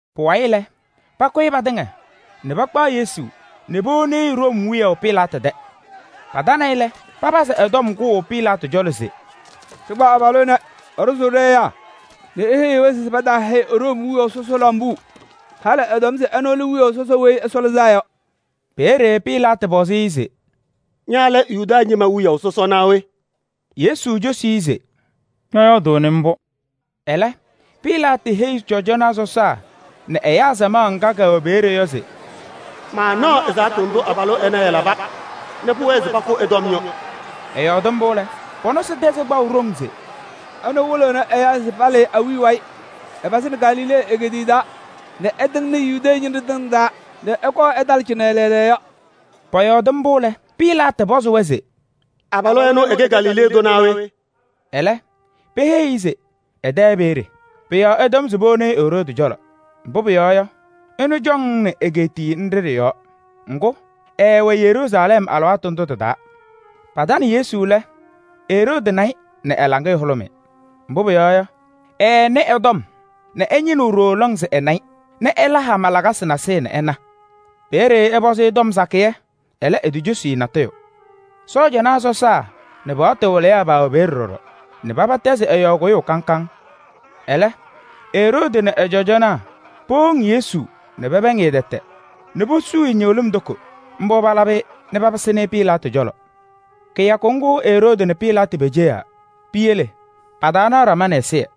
Pʋwayɩ lɛ, pakʋyɩ patɩŋa nɛ pakpaɣ Yesu nɛ powoni-i Room wiyaʋ Pilaatɩ tɛ. Patana-ɩ lɛ, papazɩ ɛ-tɔm kʋʋ Pilaatɩ cɔlɔ se: “Ɖɩkpa abalʋ ɛnɛ, ɛɖʋzʋʋ ɖɛ-ɛyaa nɛ eheyiɣ-wɛ se pataahɛyɩ Room wiyaʋ sɔsɔ lambuu. Halɩ ɛtɔm se ɛnʋ lɛ wiyaʋ sɔsɔ Weyi Ɛsɔ Lɩzaa Yɔ.” Peeye Pilaatɩ pɔzɩ-ɩ se: “Ña lɛ Yuda ñɩma wiyaʋ sɔsɔ naa we?” Yesu cosi-i se: “Ñɔyɔɔdʋʋnɩ mbʋ.” Ɛlɛ Pilaatɩ heyi Cɔjɔnaa sɔsaa nɛ ɛyaa samaɣ ŋga kɛwɛ peeye yɔ se: “Maanaɣ ɛzaɣtʋ ndʋ abalʋ ɛnɛ ɛlaba nɛ pʋwɛɛ se mankʋ ɛ-tɔm yɔ.” Ɛyɔɔdɩ mbʋ lɛ, pɔ-nɔsɩ tɛzɩ kpaʋ ɖoŋ se: “Ɛnʋ wɩlɩɣnɩ ɛyaa se palɩɩ awiya wayɩ. Ɛpazɩnɩ Galilee egeetiye taa nɛ ɛtɩŋnɩ Yudee ñɩnɖɛ tɩŋa taa nɛ ɛkɔɔ ɛtalɩ cɩnɛ lɛɛlɛɛyɔ.” Pɔyɔɔdɩ mbʋ lɛ, Pilaatɩ pɔzɩ-wɛ se: “Abalʋ ɛnʋ ɛkɛ Galilee tʋ naa we?” Ɛlɛ peheyi-i se ɛ-tɛ peeye. Pʋ-yɔɔ ɛtɔm se powoni-i Eroodi cɔlɔ, mbʋ pʋyɔɔ yɔ, ɛnʋ cɔŋaɣnɩnɩ egeetiye nɖɩ ɖɩ-yɔɔ. Ŋgʋ, ɛɛwɛ Yeruusalɛm alɩwaatʋ ndʋ tɩ-taa. Patanɩ Yesu lɛ Eroodi na-ɩ nɛ ɛ-laŋɩyɛ hʋlʋmɩ. Mbʋ pʋyɔɔ yɔ, ɛɛnɩ ɛ-tɔm nɛ ɛñɩnɩɣ ɖooo lɔŋ se ɛna-ɩ nɛ ɛla hama lakasɩ nasɩyɩ nɛ ɛna. Peeye ɛpɔzɩ-ɩ tɔm sakɩyɛ, ɛlɛ, etocosi-i natʋyʋ. Cɔjɔnaa sɔsaa nɛ paɣtʋ wɩlɩyaa paawɛ peeye ɖɔɖɔ nɛ paba tɛzɩ ɛ-yɔɔ kʋyʋʋ kaŋ kaŋ. Ɛlɛ Eroodi nɛ ɛ-sɔɔjanaa powoŋ Yesu nɛ pɛpɛɛŋ-ɩ tɛtɛ nɛ posuu-i ñɩɣlɩm toko. Mbʋ palabɩ-ɩ nɛ papɩsɩnɩ-ɩ Pilaatɩ cɔlɔ. Kɩyakʋ ŋgʋ Eroodi nɛ Pilaatɩ peceɣa. Piyele pataanaɣ ɖama nɛ ɛzɩyɛ.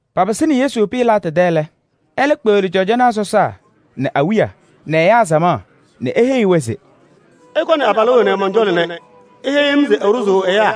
Papɩsɩnɩ Yesu Pilaatɩ tɛ lɛ, ɛlɛ kpeɣli cɔjɔnaa sɔsaa nɛ awiya nɛ ɛyaa samaɣ nɛ eheyi-wɛ se: “Ɩkɔnɩ abalʋ ɛnɛ mɔn-cɔlɔ nɛ iheyi-m se ɛɖʋzʋʋ ɛyaa.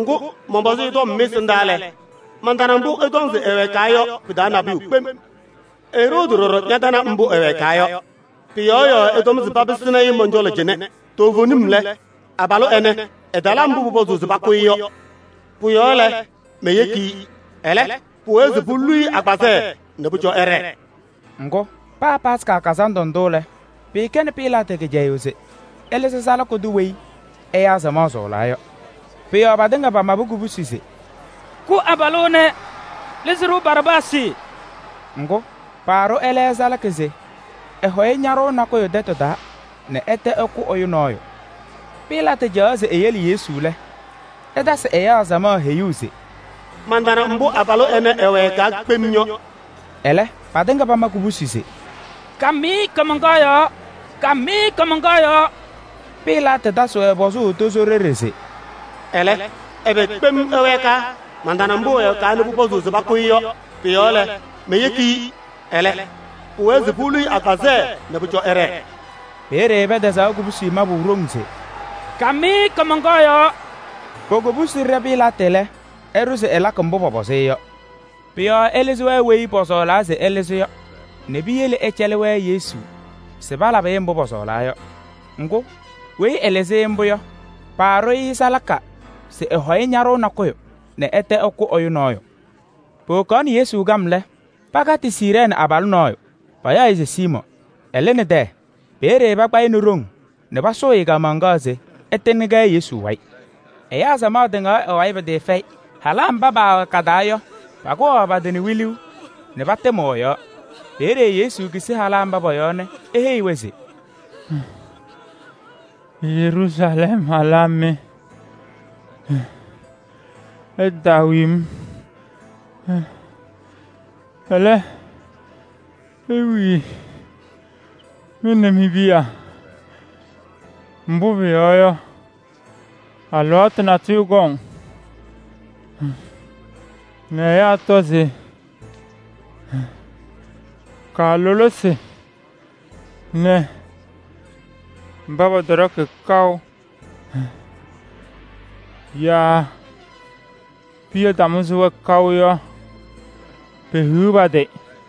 Ŋgʋ, mɔnpɔzɩ-ɩ tɔm mɩ-ɛsɩndaa lɛ, mantana mbʋ ɩtɔŋ se ɛwɛɛkaa yɔ pɩ-taa nabʋyʋ kpem. Eroodi ɖɔɖɔ ñatana mbʋ ɛwɛɛkaa yɔ. Pʋ-yɔɔ ɛtɔm se papɩsɩnɩ-ɩ mɔn-cɔlɔ cɩnɛ. Toovenim lɛ, abalʋ ɛnɛ, ɛtala mbʋ pʋpɔzʋʋ se pakʋ-ɩ yɔ. Pʋ-yɔɔ lɛ, meyeki-i. Ɛlɛ, pʋwɛɛ se polu-i agbazɛɛ nɛ pʋcɔ ɛɖɛɛ.” [ Ŋgʋ, paa Yomiye Taa Lɩʋ Kazandʋ ndʋ lɛ, pɩɩkɛnɩ Pilaatɩ kɩcɛyʋʋ se ɛlɩzɩ salaka tʋ weyi ɛyaa samaɣ sɔɔlaa yɔ.] Pʋ-yɔɔ patɩŋa pamabɩ kubusi se: “Kʋ abalʋ ɛnɛ! Lɩzɩ-ɖʋ Baraabaasɩ!” Ŋgʋ, paaɖʋ ɛlɛ salaka se ɛlɩzɩ ñaɖʋʋ nakʋyʋ tɛtʋ taa nɛ ɛtɛ ɛkʋ ɛyʋ nɔɔyʋ. Pilaatɩ caɣaɣ se eyele Yesu lɛ, ɛtasɩ ɛyaa samaɣ heyuu se: “Mantana mbʋ abalʋ ɛnɛ ɛwɛɛkaa kpem yɔ.” Ɛlɛ, patɩŋa pama kubusi se: “Kam-ɩ kaamaŋkaɣ yɔɔ! Kam-ɩ kaamaŋkaɣ yɔɔ!” Pilaatɩ tasɩ-wɛ pɔzʋʋ tozo ɖeɖe se: “Ɛlɛ, ɛbɛ kpem ɛwɛɛkaa? Mantana mbʋ ɛwɛɛkaa nɛ pʋpɔzʋʋ se pakʋ-ɩ yɔ. Pʋ-yɔɔ lɛ, meyeki-i. Ɛlɛ, pʋwɛɛ se polu-i agbazɛɛ nɛ pʋcɔ ɛɖɛɛ.” Peeye pɛtɛzaɣ kubusi mabʋ ɖoŋ se: “Kam-ɩ kaamaŋkaɣ yɔɔ!” Po-kobusi ɖɛ Pilaatɩ lɛ, ɛɖʋ se ɛlakɩ-wɛ mbʋ pɔpɔzɩ-ɩ yɔ. Pʋ-yɔɔ ɛlɩzɩ weyi pɔsɔɔlaa se ɛlɩzɩ yɔ nɛ piyele ɛcɛlɩ-wɛ Yesu se palabɩ-ɩ mbʋ pɔsɔɔlaa yɔ. Ŋgʋ, weyi ɛlɩzɩ-ɩ mbʋ yɔ, paaɖʋ-ɩ salaka se ɛlɩzɩ ñaɖʋʋ nakʋyʋ nɛ ɛtɛ ɛkʋ ɛyʋ nɔɔyʋ. Powokaɣnɩ Yesu kam lɛ, pakatɩ Siirɛɛnɩ abalʋ nɔɔyʋ, payaɣ-ɩ se Siimɔɔ. Ɛlɩnɩ tɛyɛ. Peeye pakpa-ɩ nɛ ɖoŋ nɛ pasʋʋ-ɩ kaamaŋkaɣ se ɛtɩŋnɩ-kɛ Yesu wayɩ. Ɛyaa samaɣ tɩŋaɣ ɛ-wayɩ pɩtɩɩfɛyɩ. Halaa mba paawɛ ka-taa yɔ, pakʋwaɣ pa-tɩ nɛ wiluu nɛ patɩmɩɣ ɛ-yɔɔ. Peeye Yesu kisini halaa mba pɔ-yɔɔ nɛ eheyi-wɛ se: “Yeruusalɛm halaa mɩ! Ɩtaawi-m, ɛlɛ, iwii mɩ nɛ mi-piya. Mbʋ pʋyɔɔ yɔ, alɩwaatʋ natʋyʋ kɔŋ nɛ ɛyaa tɔ se: ‘Kaalʋlɩsɩ nɛ mba pɔtɔɖɔkɩ kaʋ yaa piya tamʋzɩ-wɛ kaʋ yɔ, pehiɣ pa-tɩ!’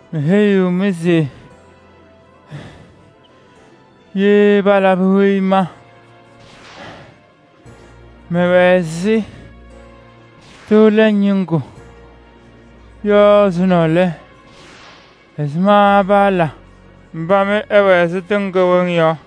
Meheyiɣ-mɩ se ye palabɩ weyi ma mɛwɛ ɛzɩ tɩʋ lɛŋ ñɩŋgʋ yɔ ɛzʋnɔ lɛ, ɛzɩma paala mba mɩ ɩwɛ ɛzɩ tɩŋ kɩwɩŋ yɔ?”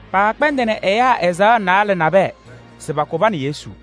Paakpɛndɩnɩ ɛyaa azaɣa naalɛ nabɛyɛ se pakʋ pa nɛ Yesu.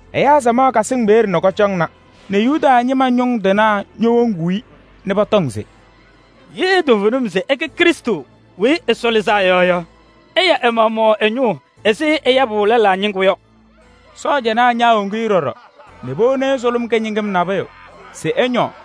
Ɛyaa samaɣ kasɩŋ peeye nɛ kɔcɔŋna nɛ Yuda ñɩma ñʋŋ tɩnaa ñowoŋuu-i nɛ pɔtɔŋ se: “Ye toovenim se ɛkɛ Krɩstʋ Weyi Ɛsɔ Lɩzaa Yɔ yɔ, ɛya ɛ-maɣmaɣ ɛ-ñʋʋ ɛzɩ ɛyabʋ lɛlaa ñɩŋgʋ yɔ!” Sɔɔjanaa ñaawoŋ-i ɖɔɖɔ nɛ powoni-i sʋlʋm kɩñɩŋɩm nabʋyʋ se ɛñɔɔ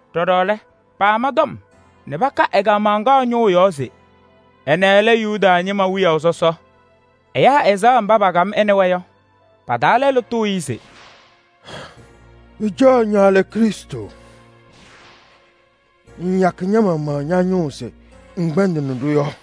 Ɖɔɖɔ lɛ, paama tɔm nɛ paka ɛ-kaamaŋkaɣ ñʋʋ yɔɔ se: “Ɛnɛ lɛ Yuda ñɩma wiyaʋ sɔsɔ.” Ɛyaa azaɣa mba pakam ɛ nɛ wɛ yɔ, pa-taa lɛlʋ tʋʋ-ɩ se: “Pɩcaɣ ña lɛ Krɩstʋ? Ŋŋyakɩ ña-maɣmaɣ ña-ñʋʋ se ŋkpɛndɩnɩ-ɖʋ yɔ?”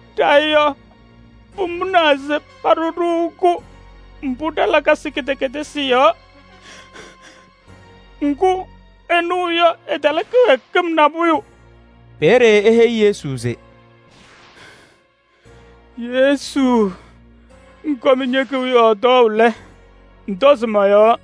Ɖa yɔ, pʋmʋnaa se paɖʋ-ɖʋ-kʋ mbʋ ɖa-lakasɩ kɩdɛkɛdɩsɩ yɔɔ. Ŋgʋ ɛnʋ yɔ, ɛtala kɩwɛɛkɩm nabʋyʋ. Peeye eheyi Yesu se: “Yesu! Ŋkɔm ñe-kewiyaɣ tɔɔʋ lɛ, ŋtɔzɩ mɔ-yɔɔ.”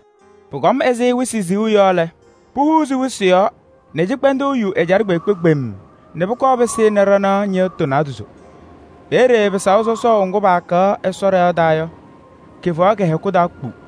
Pʋkɔm ɛzɩ wɩsɩ siɣu yɔ lɛ, puhuuzi wɩsɩ yɔɔ nɛ cɩkpɛndʋʋ yu ɛjaɖɛ kpeekpe kpemm nɛ pʋkɔɔ pɩsɩnɩ ɖanaɣ ñɩɣtʋ naadozo. Peeye pɩsaʋ sɔsɔʋ ŋgʋ paakaɣ Ɛsɔ ɖɩɣa taa yɔ, kɩfaɣ kɩ-hɛkʋ taa kpu.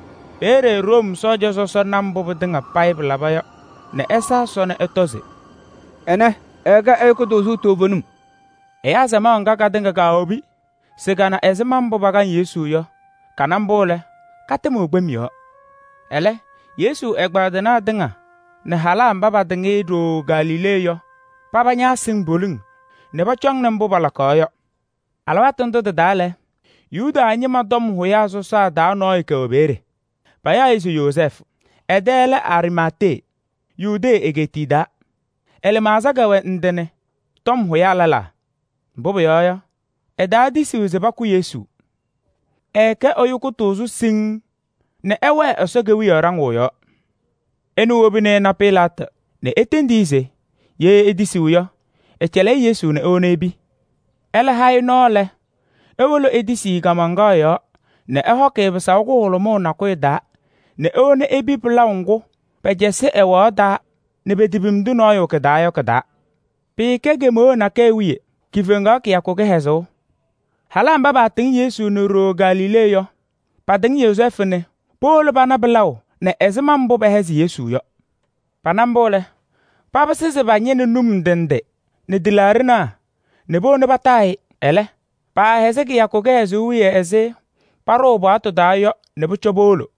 Peeye Room sɔɔja sɔsɔ na mbʋ pɩtɩŋa pɩlaba yɔ nɛ ɛsa Ɛsɔ nɛ ɛtɔ se: “Ɛnɛ, ɛɛkɛ ɛyʋ kʋtʋʋzʋ toovenim!” Ɛyaa samaɣ ŋga katɩŋa kaawobi se kana ɛzɩma mbʋ pakaŋ Yesu yɔ, kana mbʋ lɛ, katɩmɩɣ kpem yɔɔ. Ɛlɛ Yesu ɛgbaadɩnaa tɩŋa nɛ halaa mba patɩŋ-ɩ nɛ ɖooo Galilee yɔ, paba ñaasɩŋ poliŋ nɛ pɔcɔŋnɩ mbʋ pɩlakaɣ yɔ. Alɩwaatʋ ndʋ tɩ-taa lɛ, Yuda ñɩma tɔm hʋyaa sɔsaa taa nɔɔyʋ kɛwɛ peeye, payaɣ-ɩ se Yozɛɛfʋ. Ɛ-tɛ lɛ Ariimatee, Yudee egeetiye taa. Ɛ-lɩmaɣza kɛwɛ ndɩ nɛ tɔm hʋyaa lɛlaa. Mbʋ pʋyɔɔ yɔ, ɛtaatisiɣ se pakʋ Yesu. Ɛɛkɛ ɛyʋ kʋtʋʋzʋ siŋŋ nɛ ɛwɛɛ Ɛsɔ Kewiyaɣ ɖaŋʋʋ yɔɔ. Ɛnʋ wobini ɛna Pilaatɩ nɛ etendi-i se ye etisiɣ yɔ, ɛcɛlɩ-ɩ Yesu nɛ ewoni epi. Ɛlɛ ha-ɩ nɔɔ lɛ, ewolo etisi-i kaamaŋkaɣ yɔɔ nɛ ɛhɔkɩ-ɩ pɩsaʋ kʋhʋlʋmʋʋ nakʋyʋ taa nɛ ewoni-i epi pɩlaʋ ŋgʋ pɛcɛsɩ ɛwaɣ taa nɛ petepimdi nɔɔyʋ kɩ-taa yɔ kɩ-taa. Pɩɩkɛ kemeɣa nakɛyɛ wiye, kifeŋaɣ kɩyakʋ kɩhɛzʋʋ. Halaa mba paatɩŋ Yesu nɛ ɖooo Galilee yɔ, patɩŋ Yozɛɛfʋ nɛ powolo pana pɩlaʋ nɛ ɛzɩma mbʋ pɛhɛzɩ Yesu yɔ. Pana mbʋ lɛ, papɩsɩ se pañɩnɩ num ndɩ ndɩ nɛ tɩlaaɖɩnaa nɛ powoni pataa-ɩ. Ɛlɛ, paahɛzɩ kɩyakʋ kɩhɛzʋʋ wiye ɛzɩ paɖʋʋ paɣtʋ taa yɔ nɛ pʋcɔ powona.